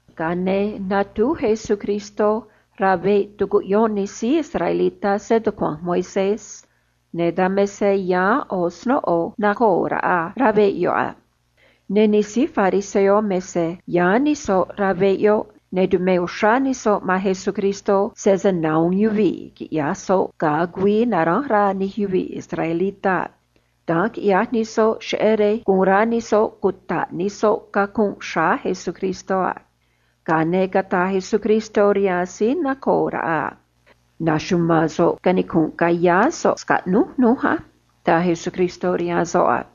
Ga̱a ne̱ catúj uún Jesús rá veꞌ tucuꞌyón nij síí israelitá stucua̱nj Moisés, ne̱ dan me se yáán ꞌo̱ snóꞌo nacoo̱ raꞌa rá veꞌ yoꞌ a. Ne̱ do̱j nij síí fariseo me se yáán nij soꞌ rá veꞌ yoꞌ, ne̱ tumé uxrá nij soꞌ man Jesús sese nahu̱un snóꞌo yoꞌ quiꞌya̱j Jesús ga̱a güii naránj rá nij yuvii̱ israelitá a. Da̱nj quiꞌyaj nij soꞌ cheꞌé rej cuta̱ꞌ nij soꞌ cacunꞌ xráá Jesús a. Ga̱a ne̱ cataj Jesús rihaan síí nacoo̱ raꞌa a: ―Na̱xuma̱a̱n so̱ꞌ canicu̱nꞌ ca̱yá so̱ꞌ scaꞌnúj núj á ―taj Jesús a.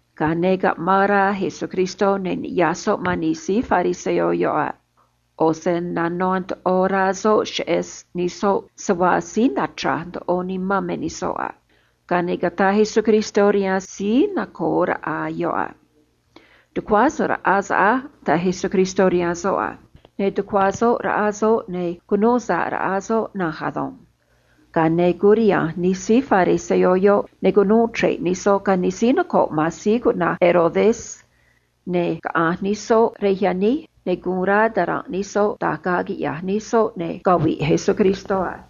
Ga̱a ne̱ caꞌmaan rá Jesús, ne̱ niꞌya̱j soꞌ man nij síí fariseo yoꞌ a. ꞌO̱ se nanó ndoꞌo rá soꞌ cheꞌé se síí nichra̱j ndoꞌo nimán me nij soꞌ a. Ga̱a ne̱ cataj Jesús rihaan síí nacoo̱ raꞌa yoꞌ a: ―Tu̱cuá so̱ꞌ raꞌá so̱ꞌ á ―taj Jesús a. Ne̱ tucuá soꞌ raꞌa soꞌ, ne̱ cunuu sa̱ꞌ raꞌa soꞌ na̱nj ado̱nj. Ga̱a nu̱ꞌ curiha̱nj nij síí fariseo yoꞌ, ne̱ cunuu chre̱ꞌ nij soꞌ ga̱ nij síí noco̱ꞌ man síí cuꞌna̱j Herodes, ne̱ nuchruj ra̱a̱ ta̱ranꞌ nij soꞌ da̱j ga̱a̱ quiꞌya̱j nij soꞌ ne̱ cavi̱ꞌ Jesús a.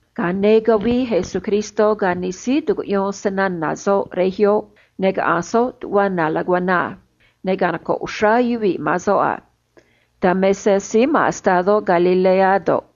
Ga̱a ne̱ cavii Jesús ga̱ nij síí tucuꞌyón snana̱ soꞌ rej yoꞌ, ne̱ caꞌanj soꞌ tuꞌva na laguaná a. Ne̱ canocoꞌ ri̱i̱ uxrá yuvii̱ man soꞌ a. Dan me se síí ma̱n estadó Galilea do̱ꞌ,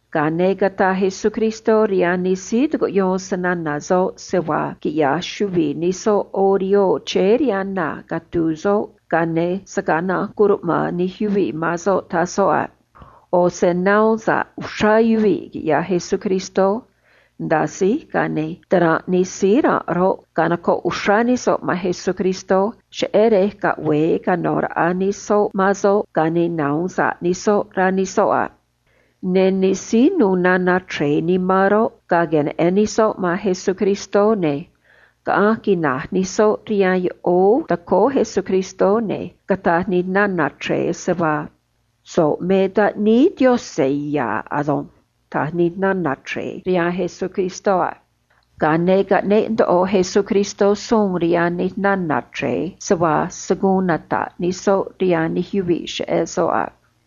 Ga̱a ne̱ cataj Jesús rihaan nij síí tucuꞌyón snana̱ soꞌ se vaa quiꞌya̱j chuvi̱i nij soꞌ ꞌo̱ rihoo chéé rihaan na catu̱u̱ soꞌ, ga̱a ne̱ se̱ gaa na̱nj curuꞌma̱an nij yuvii̱ man soꞌ, taj soꞌ a. ꞌO̱ se nahuun sa̱ꞌ uxrá yuvii̱, quiꞌyaj Jesús, ne̱ nda̱a síj, ga̱a ne̱ ta̱ranꞌ nij síí ranꞌ roꞌ, canocoꞌ uxrá nij soꞌ man Jesús cheꞌé rej caꞌve̱e cano̱ raꞌa nij soꞌ man soꞌ ga̱a ne̱ nahu̱un sa̱ꞌ nij soꞌ, rá nij soꞌ a. Ne̱ nij síí nu̱u̱ nana̱ chre̱e nimán roꞌ, ga̱a queneꞌen nij soꞌ man Jesús, ne̱ quinij ru̱j nij soꞌ tacóó Jesús, ne̱ cataj nij nana̱ chre̱e a: ―So̱ꞌ me Taꞌníí Yaꞌanj ya̱ ado̱nj ―taj nij soꞌ a. Ga̱a ne̱ caꞌneꞌ ndoꞌo Jesús suun rihaan nij nana̱ chre̱e se vaa se̱ guun nata̱ꞌ nij soꞌ rihaan nij yuvii̱ cheꞌé soꞌ a.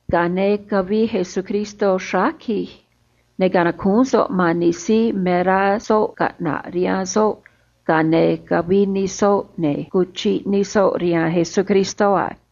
Ga̱a ne̱ cavii Jesús rej tacaan, ne̱ canacúún soꞌ man nij síí me rá soꞌ caꞌna̱ꞌ rihaan soꞌ, ga̱a ne̱ cavii nij soꞌ, ne̱ cuchiꞌ nij soꞌ rihaan Jesús a.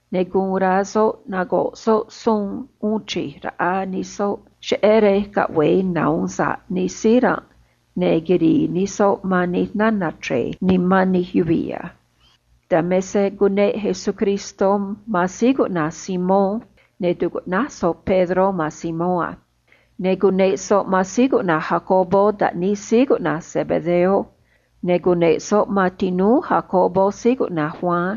Ne̱ guun rá soꞌ nago̱ꞌ soꞌ suun uun chij raꞌa nij soꞌ cheꞌé rej caꞌve̱e nahu̱un sa̱ꞌ nij síí ranꞌ ne̱ quiri̱i̱ nij soꞌ man nij nana̱ chre̱e nimán nij yuvii̱ a. Dan me se cuneꞌ Jesús man síí cuꞌna̱j Simón, ne̱ tucuꞌnáj soꞌ Pedró man Simón a. Ne̱ cuneꞌ soꞌ man Jacobo taꞌníí síí cuꞌna̱j Zebedeo, ne̱ cuneꞌ soꞌ man tinúú Jacobo síí cuꞌna̱j Juan,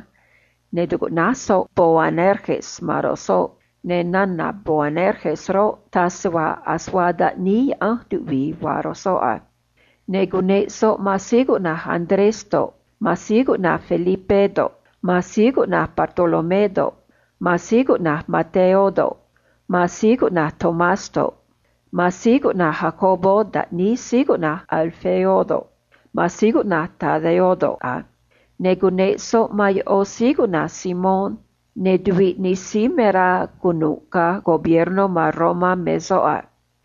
ne̱ tucuꞌnáj soꞌ Boanerges man ro̱j soꞌ, ne̱ nana̱ Boanerges roꞌ, me raj cata̱a ase vaa taꞌníí tuꞌvii vaa ro̱j soꞌ a. Ne̱ cuneꞌ soꞌ man Andrés do̱ꞌ, Felipé do̱ꞌ, Bartolomé do̱ꞌ, Mateo do̱ꞌ, Tomás do̱ꞌ, Jacobo taꞌníí síí cuꞌna̱j Alfeo do̱ꞌ, Tadeo do̱ꞌ a. Ne̱ cuneꞌ soꞌ man ꞌó síí cuꞌna̱j Simón, ne̱ tuviꞌ nij síí me rá cunu̱ꞌ ga̱ gobiernó ma̱n Romá me soꞌ a.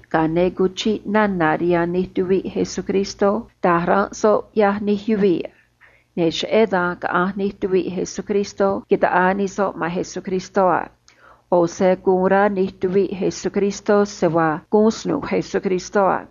Ga̱a ne̱ cuchiꞌ nana̱ rihaan nij tuviꞌ Jesús da̱j ranꞌ soꞌ ꞌyaj nij yuvii̱, ne̱ cheꞌé dan caꞌanj nij tuviꞌ Jesús ta̱ꞌaa nij soꞌ man Jesús, cheꞌé se cataj nij soꞌ se vaa snúú Jesús a.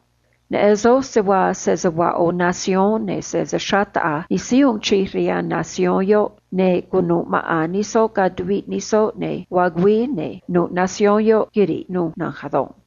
Neꞌen soj se vaa sese vaa ꞌo̱ yoꞌóó noco̱o, ne̱ sese xraꞌ taꞌa̱j nij síí uun chij rihaan yoꞌóó noco̱o yoꞌ, ne̱ vaa güii, ne̱ nu̱ꞌ yoꞌóó noco̱o yoꞌ quiri̱ꞌ nu̱ꞌ na̱nj ado̱nj.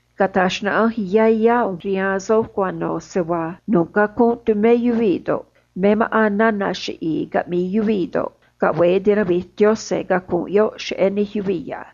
’Cata̱j xnaꞌanj yá yá ꞌu̱nj rihaan soj cuano̱ se vaa nu̱ꞌ cacunꞌ tumé yuvii̱ do̱ꞌ, me maꞌa̱n nana̱ qui̱j caꞌmi̱i̱ yuvii̱ do̱ꞌ roꞌ, caꞌve̱e tinavi̱j Yaꞌanj cacunꞌ yoꞌ cheꞌé nij yuvii̱ a.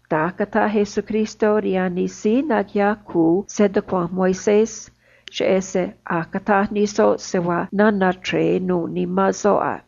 Da̱nj cataj Jesús rihaan nij síí naquiꞌyaj cu̱u stucua̱nj Moisés, cheꞌé se a̱j cataj nij soꞌ se vaa nana̱ chre̱e nuû nimán soꞌ a.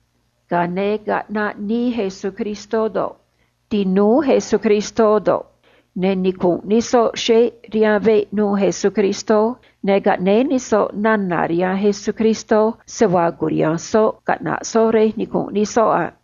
Ga̱a ne̱ caꞌnaꞌ nii Jesús ga̱ nij tinúú Jesús, ne̱ nicunꞌ nij soꞌ xeꞌ rihaan veꞌ nu̱u̱ Jesús, ne̱ caꞌnéé nij soꞌ nana̱ rihaan Jesús se vaa cu̱riha̱nj soꞌ caꞌna̱ꞌ soꞌ rej nicu̱nꞌ nij soꞌ a.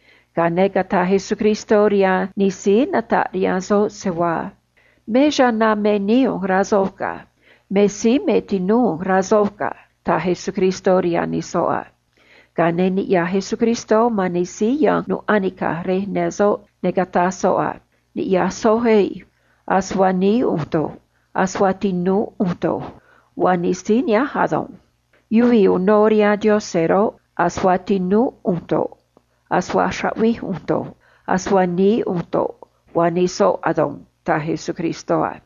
Ga̱a ne̱ cataj Jesús rihaan nij soꞌ a: ―Me chana̱ me nií ꞌu̱nj, rá soj ga̱. Me síí me tinúú ꞌu̱nj, rá soj ga̱ ―taj Jesús a. Ga̱a ne̱ niꞌya̱j Jesús man nij síí ya̱nj nu̱ꞌ anica̱j xꞌnúú soꞌ, ne̱ cataj soꞌ a: ―Ni̱ꞌyaj soj á. Ase vaa nií ꞌu̱nj do̱ꞌ, ase vaa tinúú ꞌu̱nj do̱ꞌ, vaa nij síí nihánj ado̱nj. Yuvii̱ ꞌo̱ uno rihaan Yaꞌanj roꞌ, ase vaa tinúú ꞌu̱nj do̱ꞌ, ase vaa raꞌvij ꞌu̱nj do̱ꞌ, ase vaa nií ꞌu̱nj do̱ꞌ, vaa nij soꞌ ado̱nj ―taj Jesús a.